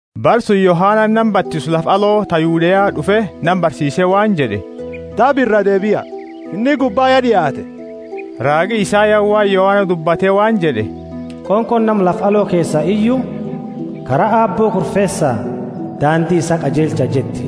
Bara suni Yohanani nama batisu lafa aloo ta Yudea d'ufe nama barsiise waan jed'e. Daba iraa deebia, Finni gubba ya, d'iaate. Raagi Isayani waan Yohana dubbate waan jed'e, Qonqooni nama lafa aloo keesa iyu: Kara Aabbo kurfeesaa, daandi isaa qajeelchaa jetti.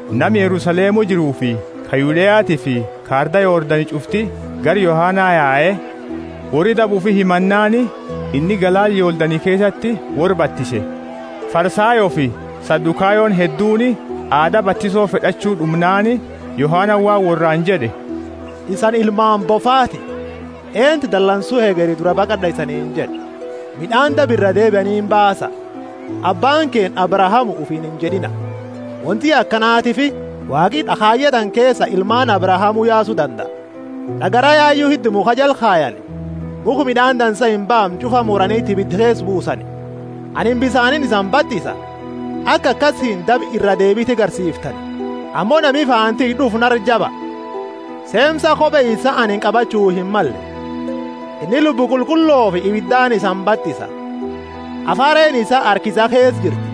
Nama Yerusalemu jiruufi ka Yudeatiifi ka arda Yordani ch'ufti gara Yohana yae. Worri daba ufi himannaani inni galaana Yordani keesati worra batise. Farisayoofi Sadukayoni hedduuni aada batiso fed'achu d'umnaani, Yohanani waan worraani jed'e, Isani ilmaani bofaati, eentu dalansu hegeri duraa baqad'a isaniini jed'e? Mid'aani daba iraa deebianiini baasa. Abbaani keenna Abrahamu ufiini injed'ina, wonti akanatiifi Waaqi d'akhaaye tana keesa ilmaani Abrahamu yaasu dandaa. D'agara yayu hidda mukha jala kayani; mukha mid'aani dansa imbaamne ch'ufa muraniti ibida keesa buusani. Anini bisaaniini isani batisa, aka akasiini isani daba iraa deebiti garsiiftani; ammo nami faana tiyya d'ufu nara jaba; seemsa kope isaa anini qabachu himmalle. Inni Lubbu Qulqullofi ibidaani isani batisa. Hafareeni isaa harka isaa keesa jirti.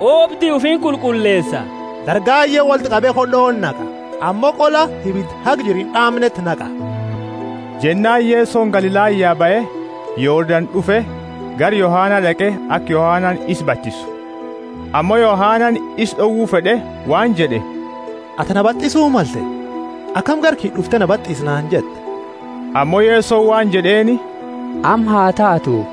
Oobdi ufi inqulqulleesa, dargaye wolti qabe khod'oti naqa, ammo qola ibida haga jiru ind'aamneti naqa. Jennaani Yesoni Galilaya bahe, Yordani d'ufe, gara Yohana d'aqe aka Yohanani isa batisu. Ammo Yohanani isa d'owu fed'e waan jed'e, Atini na batisu malte, akami gara kiyya d'ufte, Na batisi naani jetta? Ammo Yesoni waan jed'eeni, Amma ha taatu,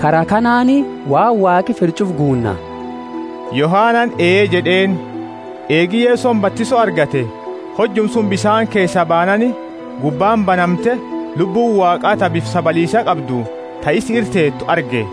kara kanaani waan Waaqi fed'u ch'ufa guunna. Jennaani Yohanani ee jed'eeni. Eegi Yesoni batiso argate, hojuma suni bisaani keesaa baanaani, gubbaani banamte, Lubbu Waaqa ta bifa sabaliisa qabdu, ta isa ira teetu arge.